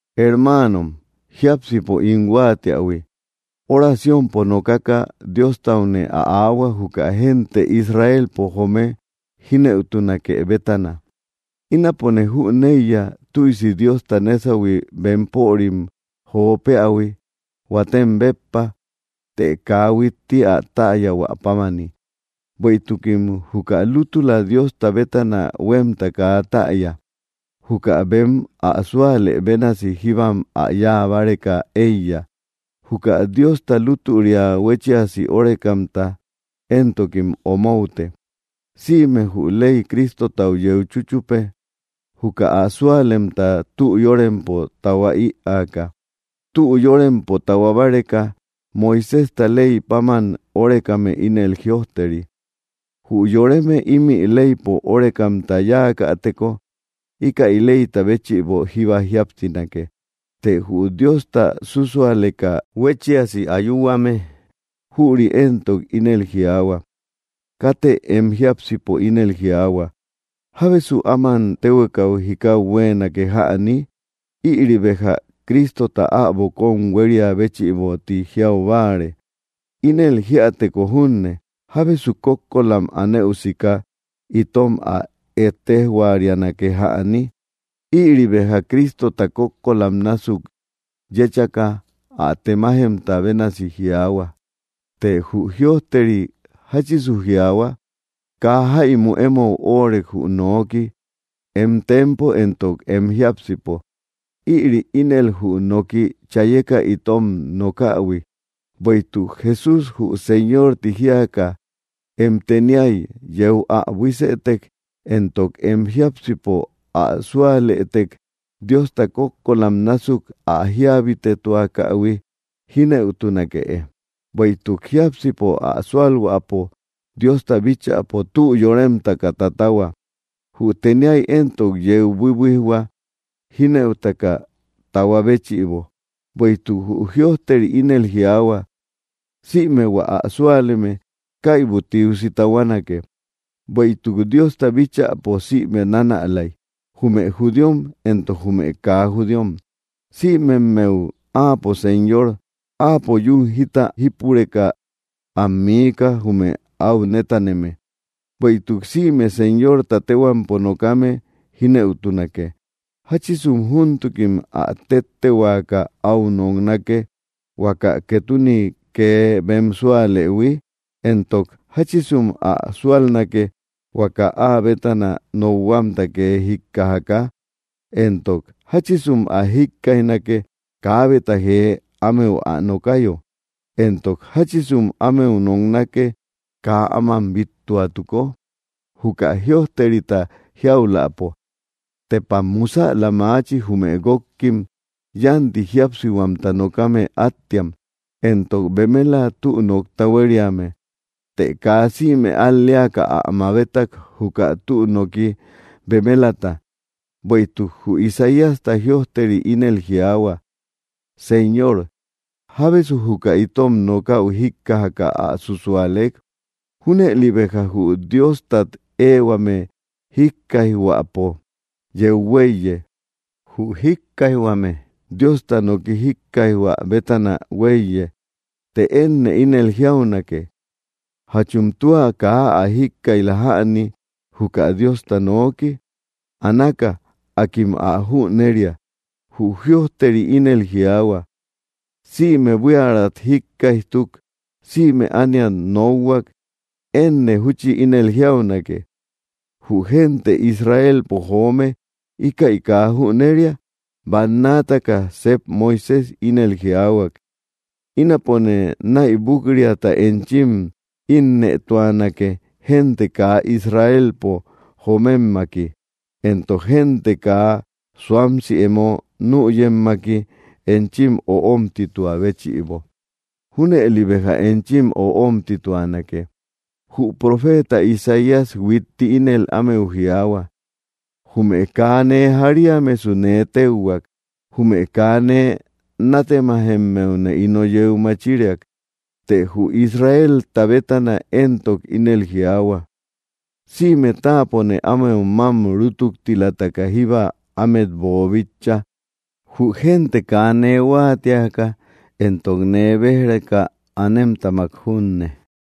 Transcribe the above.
Hermaanom, jiápsipo ín huáatiähui oraciompo nokaka Diostaune ä áahua, juka gente Israelpo joome jínëutunake bétana. Ínapone júneiya, tüisi Diosta nesahui bemporim jo peähui huatem béppa; të kaa huitti ä täyahuä pámani. Bueïtukim juka lútüla Diosta bétana huemta kaa täya. Juka bem ä súalë bénasi jíbam ä yáa báreka éiya; juka Diosta lútüria huéchiasi órekamta éntokim omoute. Sïme jü ley Cristotau yeu chúchupe, juka ä súalemta tü yórempo tahua ïaaka. Tü yórempo tahua báreka Moiséjta ley páman órekame ínel jïojteri: “Jü yoreme ímï leypo órekamta yáakäteko, íkäi leyta béchïbo jíba jíapsinake.” Të jü Diosta súsualeka huéchiasi ayuhuame, jüri éntok ínel jiaahua: “Katë em jiápsipo ínel jiaahua: ¿Jábesu áman téhuekau jikau huéenake jäni? Ïri béja Cristota äbo kóm huéria béchïbo, ti jiau báare; ínel jíäteko junne, ¿jábesu kókkolam anëu sika itom ä ettejorianake jäni?” Ïri béja Cristota kókkolam násuk yéchaka ä temajemta bénasi jiaahua. Të jü jïojteri, ¿jáchisu jiaahua? “Kaa jáimu emou óorek, jü nooki, em tempo entok em jiápsipo.” Ïri ínel jü nooki chayeka itom nokähui. Bueïtuk Jesús jü Señor ti jíaka em teniay yeu ä buísëtek, entok em jiápsipo ä súalëtek, Diosta kókkolam násuk ä jíabitetuakähui, jínëutunakee. Bueïtuk jiápsipo ä súalhuäpo Diosta bíchäpo tü yóremtaka tatahua; jü teniay éntok yeu buïbuijhua, jínëutaka tahua béchïbo. Bueïtuk jü jïojteri ínel jiaahua: “Sïme hua ä súaleme, kaibu tiusi tahuanake.” Bueïtuk Diosta bíchäpo sïme nanälay; jume judíom entok jume kaa judíom; sïmemmeu Áapo Señor. Áapo yún jita jípureka am miika, jume áu nétaneme. Bueïtuk, “Sïme Señorta téhuampo nokame, jínëutunake.” ¿Jáchisu júntukim ä téttehuaaka áu noknake, huaka ketune kee bem súalëhui? Entok, ¿jáchisum ä súalnake, huaka áa bétana nokhuamta kee jíkkajaka? Entok, ¿jáchisum ä jikkaijnake, kaabeta jee ámeu ä nokayo? Entok, ¿jáchisum ámeu noknake, kaa áman bíttuatuko? Juka jïojterita jiauläpo: “¡Tepam musäla maachi, jume guókkim, yánti jíapsihuamta nokame attiam, entok bemela tü nokta huériame!” Të kaa sïme al‑leaka ä mabetak juka tü noki bemelata; bueïtuk jü Isaíasta jïojteri ínel jiaahua: “Señor, ¿jábesu juka itom nokäu jíkkajaka ä súsualek?” Júnëli béja jü Diostat ehuame jíkkaijhuäpo yeu huéiye; jü jíkkaijhuame, Diosta noki jikkaijhuä bétana huéiye. Të énne ínel jiaunake: ¿Jachum tua kaa ä jíkkaij‑la jäni, juka Diosta nooki? Anáka; akim ä jüneria. Jü jïojteri ínel jiaahua: Sïme buíärat jíkkaijtuk, sïme ániat nokhuak. Énne júchi ínel jiaunake: ¿Jü yoremraa Israelpo joome íkäi kaa jüneria? Bannaataka sep Moisés ínel jiaahuak: Ínapone naïbuk‑riata enchim innëtuanake gente kaa Israelpo jommemaki. Entok gente kaa suamsi emo nüyemmaki enchim öomtituä béchïbo. Junëline béja enchim öomtituanake. Jü profeta Isaías huitti ínel ámeu jiaahua: Jume kaa nee jariamesu nee téuhuak; jume kaa nee nátemaymeune ino yeu machiriak. Të jü Israelta bétana éntok ínel jiaahua: “Sïme táapone ámeu mám rútuktilataka jíba ámet boobíchaïhui, jü gente kaa nee huáatiaka entok nee béj‑reka anemtamak junne.”